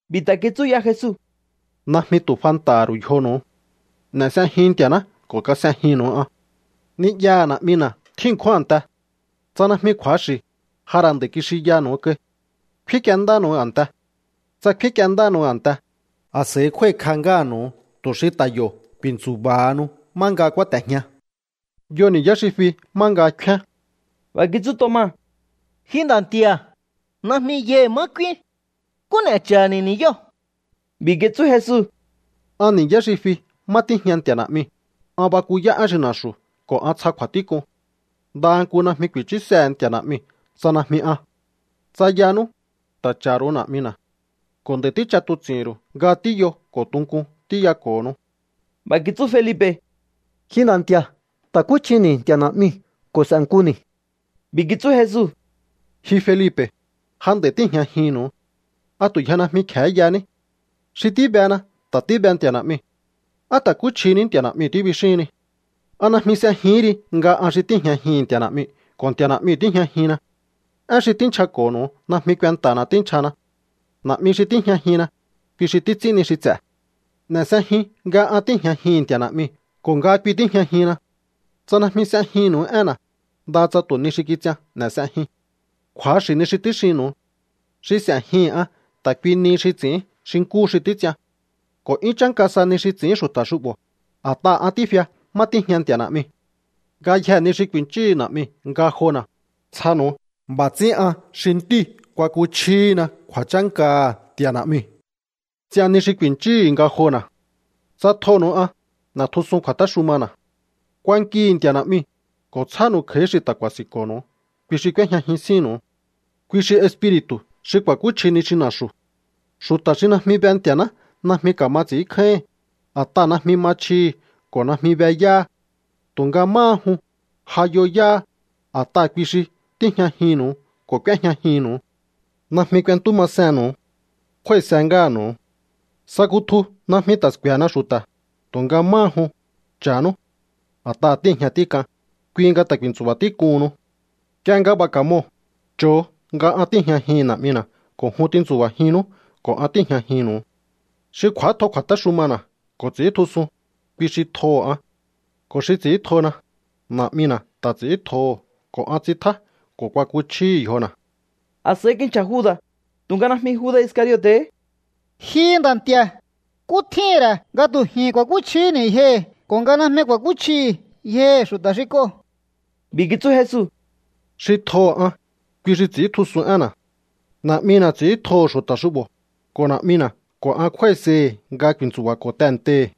B'i̱ ta̱ kitsú ya Jesu: —Najmi tu̱ fanta̱ha̱ ru̱u yjonu̱u. N'e̱ s'ejiun Nti̱a̱ná ko̱ kas'ejinnu̱u an. Ni'yaha̱ Na̱'mina̱ tjín ṉkjún a̱nte. Tsa najmi kju̱axi̱, ja ra̱ nd'a̱i̱ kixinyaha̱nu̱u kai. Kfín k'uendánu̱u a̱nte. Tsa kfín k'uendánu̱u a̱nte, a̱s'a̱i kjúái̱kj'a ngáha̱nu̱u tu̱ xi ta̱ yo̱ ku̱i̱ntsu̱ba̱hanu má nga kúáte̱jña. Yo ni̱yá xi fi má nga kfíán. B'a̱ kitsú Toma: —Ji Nda̱ Nti̱a̱, najmi yai̱ má k'úín. ¿Nkú n'e̱ cha̱ha̱ni̱ ni̱yóo̱? B'i̱ kitsú Jesu: —An ni̱yá xi fi má tíjña Nti̱a̱ Na̱'miu̱, an bakuyá én xi na̱xu̱ ko̱ an tsja kju̱a̱tík'un. Ndaha nku najmi ku̱i̱chúsehe̱ Nti̱a̱ Na̱'miu̱ tsa najmi an. Tsa yanú, ta̱ cha̱ ru̱u Na̱'mina̱. Ko̱ nd'a̱i̱ tích'atuts'i̱hi̱n ru̱u nga tíyo ko̱ tunkun tíyako̱honu. B'a̱ kitsú Felipe̱: —Ji Nda̱ Nti̱a̱, ta̱kúchjini̱ Nti̱a̱ Na̱'miu̱ ko̱ s'e̱nkuni̱. B'i̱ kitsú Jesu: —Ji Felipe̱, ja nd'a̱i tíi̱jñajihi̱nnu̱u. ¿A tu̱ yje najmi kje̱hé yaní? Xi tíbena ta̱ tíbe Nti̱a̱ Na̱'miu̱. ¿Á: “ta̱kúchjini̱ Nti̱a̱ Na̱'miu̱” tíbixíhinni? ¿A najmi s'ejihín ri nga an xi tíi̱jñajihi̱n Nti̱a̱ Na̱'miu̱ ko̱ Nti̱a̱ Na̱'miu̱ tíjñajinna? Én xi tínchjako̱nu̱u najmi kuenta̱na̱ tínchjahana. Na̱'mi xi tíjñajinna, kui xi títs'ín ni xi ts'e̱. N'e̱ s'ejiun nga an tíi̱jñajihi̱n Nti̱a̱ Na̱'miu̱ ko̱ nga kui tíjñajinna. Tsa najmi s'ejinnu̱u énna̱, ndaha tsa tu̱ ni xi kits'ian n'e̱ s'ejiun. ’Kju̱axi̱ ni xi tíxinnu̱u. Xi s'e̱jihi̱n an ta̱ kui nihi xi ts'i̱ín xi nkúhu xi títs'ian. Ko̱ 'yún chánka sa ni xi ts'i̱ín xu̱ta̱ xu'bo̱, a̱t'aha̱ an tífia má tíjña Nti̱a̱ Na̱'miu̱. Ngayjee̱ ni xi ku̱i̱nchíhu̱u Na̱'miu̱ ngajona̱, tsjanu̱u. B'a̱ ts'ín an xi Ntíu̱ kuakuchjíhina kju̱a̱chánkaha̱ Nti̱a̱ Na̱'miu̱. Ts'ian ni xi ku̱i̱nchúhu̱u ngajona̱. ’Tsa tjonu̱u an, n'e̱tjusun kju̱a̱téxumana̱. Kuankihi̱ Nti̱a̱ Na̱'miu̱, ko̱ tsjánu̱u kj'a̱í xi ta̱ ku̱a̱si̱nko̱nu̱u ko̱ xi k'úéjñajin sínnu̱u. Kui xi Espiri̱tu̱ xi ku̱a̱kúchji ni xi na̱xu̱. Xu̱ta̱ xi najmi be Nti̱a̱ná najmi ka̱ma ts'i̱ínkjáíhi̱n, a̱t'aha̱ najmi ma chjihi̱ ko̱ najmi be yáha. Tu̱nga máha jun, ja yo yáha, a̱t'aha̱ kui xi tíjñajinnu̱u ko̱ k'úéjñajinnu̱u. ’Najmi k'uentú masennu̱u. Kjúái̱se ngáha̱nu̱u. Sa kutju najmi ta̱ sku̱e̱hena xu̱ta̱, tu̱nga máha jun, cha̱nú. A̱t'aha̱ tíi̱jña tík'an, kui nga ta̱ ku̱i̱ntsu̱ba̱ tík'uhunnu. Nk'ie nga b'a̱ ka̱moo̱, cho̱o nga an tíi̱jñajihi̱n Na̱'mina̱ ko̱ jun tintsu̱ba̱jinnú ko̱ an tíi̱jñajinnu̱u. Xi kj'u̱átjo kju̱a̱téxumana̱ ko̱ ts'i̱íntjusun, kui xi tjoho̱ an. Ko̱ xi ts'i̱íntjona, Na̱'mina̱ ta̱ ts'i̱íntjoho̱ ko̱ an ts'intjá ko̱ kuakuchjíhi̱ yjona̱. A̱s'a̱i kinchja̱ Juda̱, tu̱nga najmi Juda̱ Iscariote̱hé: —Ji Nda̱ Nti̱a̱, ¿nkú tjíhi̱n ra̱ nga tu̱ ji̱n ku̱a̱kúchjihíni̱ yjohi̱ ko̱ nga najmi ku̱a̱kúchjihi̱ yjohi̱ xu̱ta̱ xi k'oo̱? B'i̱ kitsú Jesu: —Xi tjoho̱ an, kui xi ts'i̱íntjusun énna̱. Na̱'mina̱ ts'i̱íntjoho̱ xu̱ta̱ xu'bo̱, ko̱ Na̱'mina̱ ko̱ an kjúái̱sei̱hi̱ nga ku̱i̱ntsu̱ba̱ko̱ tehe̱ntei̱.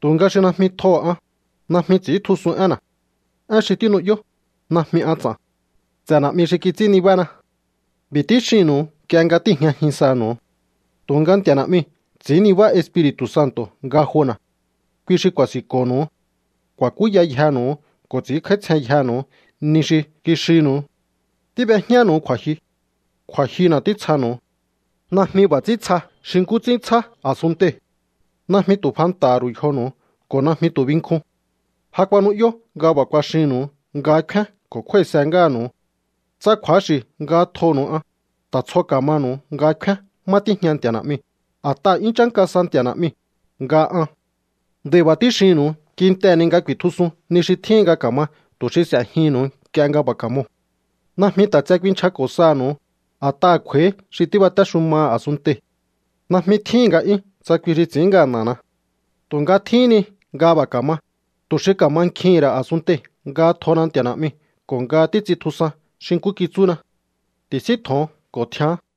Tu̱nga xi najmi tjoho̱ an, najmi ts'i̱íntjusun énna̱. Én xi tínu'yó, najmi an ts'a̱n. Ts'e̱ Na̱'mi xi kits'ín nibána. ’B'i̱ tíxinnu̱u nk'ie nga tíi̱jñajin sanu̱u. Tu̱nga Nti̱a̱ Na̱'miu̱ ts'i̱ín nibá Espiri̱tu̱ Santo̱ ngajona̱. Kui xi ku̱a̱si̱nko̱nu̱u. Ku̱a̱kúya yjenu̱u ko̱ ts'i̱ínkj'áítsjen yjenu̱u ni xi kixinnu̱u. ’Tíb'ejñánu̱u kju̱a̱jyu. Kju̱a̱jyuna̱ títsjanu̱u. Najmi b'a̱ ts'ín tsja xi nkú ts'ín tsjá a̱sunntei̱. Najmi tu̱ fanta̱ha̱ ru̱u yjonu̱u ko̱ najmi tu̱ binkjun. Ja kuanu'yó nga b'a̱ kuaxinnu̱u nga kfíán ko̱ kjúái̱se ngáha̱nu̱u. Tsa kju̱axi̱ nga tjonu̱u an, ta̱ tsjo ka̱manu̱u nga kfíán má tíjña Nti̱a̱ Na̱'miu̱, a̱t'aha̱ 'yún chánka sa Nti̱a̱ Na̱'miu̱ nga an. Nd'a̱i̱ b'a̱ tíxinnu̱u kintehe̱ ni nga ku̱i̱tjusun ni xi tjíhin nga ka̱ma tu̱ xi s'e̱jihi̱nnu̱u nk'ie nga b'a̱ ka̱moo̱. ’Najmi ta̱ tse kuinchjako̱ saha̱nu̱u, a̱t'aha̱ kj'u̱a̱í xi tíbatéxumaha̱ a̱sunntei̱. Najmi tjíhi̱n nga'yún tsa kui xi ts'i̱ín ngana̱na. Tu̱nga tjíhín ni nga b'a̱ ka̱ma, tu̱ xi ka̱mankjihi̱n ra̱ a̱sunntei̱ nga tjona Nti̱a̱ Na̱'miu̱ ko̱ nga títs'intjusan xi nkú kitsúna. Ti̱síntjo̱on ko̱ tjián.